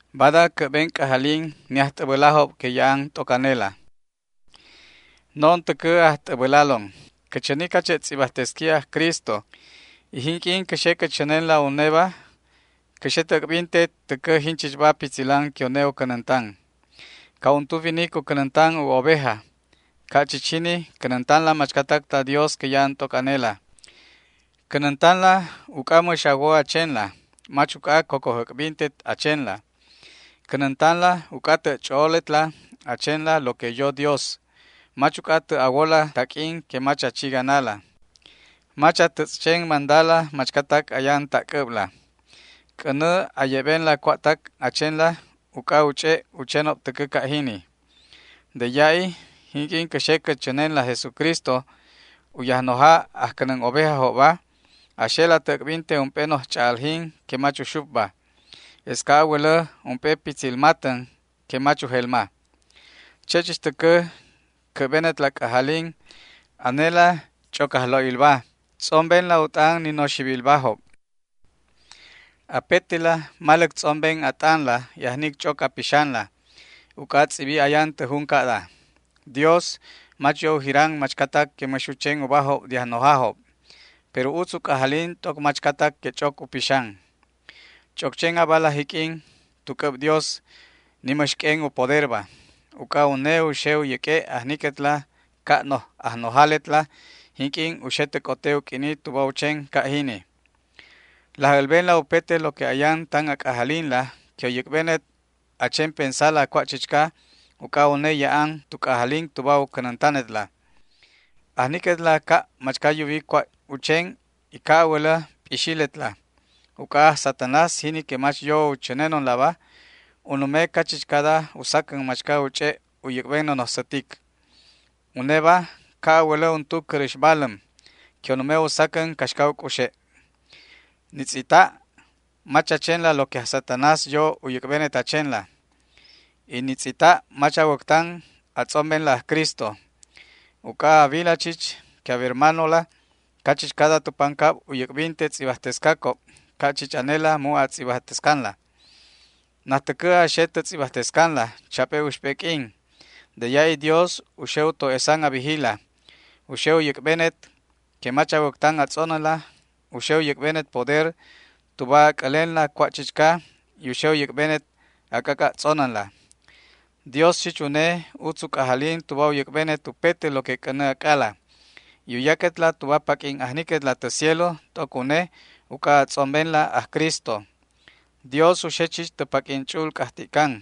Bada cä'ben c'ajalin ni ajt'äbälajob que ya'an t'oc anela. No'on täcä ajt'äbälalon. Cä chäni cache' tz'ibajtesqui aj Cristo, y jinq'uin cä xe cä chänenla uneba cä xe tä äc'binte täcä jinchichba pitzilan que une u cänäntan. Ca' untu winic u cänäntan u oveja, ca' chich jini cänäntanla machcatac ta Dios que ya'an t'oc anela. Cänäntanla uc'a mäx a wo a chenla, mach uc'a cocoj äc'bintet a chenla. Cänäntanla uc'a tä' ch'o'oletla a chenla lo que yo Dios, mach uc'a tä' a wola taq'uin que mach a chi ganala. Mach a tätz' chen mandala machcatac ayan ta' c'äbla. C'änä a ye'benla cua'tac a chenla uc'a u ch'e' u chenob täcä ca' jini. De ya'i, jinq'uin cä xe cä chänenla aj Jesucristo, u Yajnoja ajcänän ovejajobba, a xela tä äc'binte ump'e noj ch'a'aljin que mach uxupba. Es ca' a wälä ump'e pitzil matän que mach ujelma. Che' chich täcä cä'benetla c'ajalin, anela ch'oc ajlo'ilba. Tz'ombenla u t'an ni noxibilbajob. Apetela maläc tz'omben a t'anla y ajnic ch'oc a pixanla. Uc'a tz'ibi ayan tä jun ca'da: Dios mach yo u jiran machcatac que mäx u chen ubajob de ajnojajob, pero utz u c'ajalin t'oc machcatac que ch'oc u pixan. Ch'oc chen abala jiq'uin tu c'äb Dios, ni mäx q'uen u poderba. Uc'a une u xe u yäq'ue' ajniquetla ca' noj ajnojaletla jinq'uin u xe tä c'ote u q'uini tuba u chen ca' jini. Laj älbenla upete lo que ayan tan a c'ajalinla que u yäc'benet a chen pensala cua' chichca, uc'a une ya'an tu c'ajalin tuba u cänäntanetla. Ajniquetla ca' machca yuwi cua' u chen y ca' a wälä p'ixiletla, uc'a aj Satanás, jini que mach yo u chänenonlaba, u nume cachichcada u sacän machca u ch'e' u yäc'ben nonoj sätic. Uneba ca' a wälä untu cäräx baläm que u nume u sacän caxca u c'uxe'. Ni tz'ita' mach a chenla lo que aj Satanás yo u yäc'benet a chenla, y ni tz'ita' mach a wäctan a tz'ombenla aj Cristo. Uc'a a wila chich que a wermanola cachichcada tu pancab u yäc'binte tz'ibajtescacob ca' chich anela mu' a tz'ibajtescanla. Najtäcä a xe tä tz'ibajtescanla chap'e uxp'e q'uin. De ya'i Dios u xe u to'esan a bijila, u xe u yäc'benet que mach a wäctan a tz'onänla, u xe u yäc'benet poder tuba a c'älenla cua' chichca y u xe u yäc'benet a c'ac'a' tz'onänla. Dios chich une utz u c'ajalin tuba u yäc'benet upete lo que c'änä ac'ala, y u yaquetla tuba paq'uin ajniquetla tä cielo t'oc une uc'a a tz'ombenla aj Cristo. Dios u xe chich tä paq'uin ch'u'ul c'ajti'can,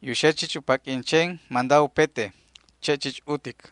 y u xe chich u paq'uin chen manda upete. Che' chich utic.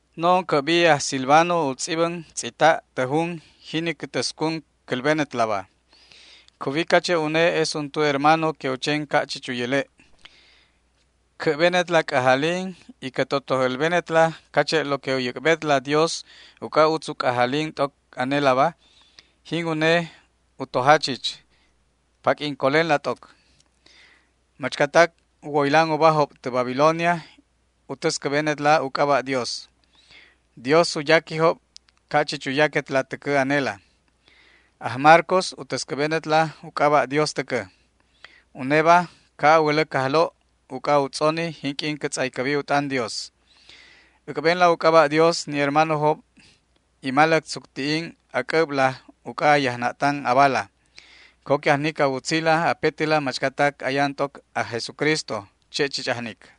No'on cä'bi aj Silvano u tz'ibän tz'ita' tä jun jini cä täscun cälbenetlaba. Cuwi cache' une es untu hermano que u chen ca' chich u yäle'. Cä'benetla c'ajalin y cä totoj älbenetla cache' lo que u yäc'betla Dios uc'a utz u c'ajalin t'oc anelaba, jin une u toja chich. Paq'uin colenla t'oc. Machcatac u woylan ubajob tä Babilonia u täscäbenetla u c'aba' Dios. Dios u yaquijob ca' chich u yaquetla täcä anela. Aj Marcos u täscäbenetla u c'aba' Dios täcä. Uneba ca' a wälä cajlo' uc'a u tz'oni jinq'uin cä tz'aycäbi u t'an Dios. Äc'benla u c'aba' Dios ni hermanojob y maläc tzucti'in a c'äbla uc'a a yajna'tan abala. Co que ajnic a wutzila apetela machcatac ayan t'oc aj Jesucristo. Che' chich ajnic.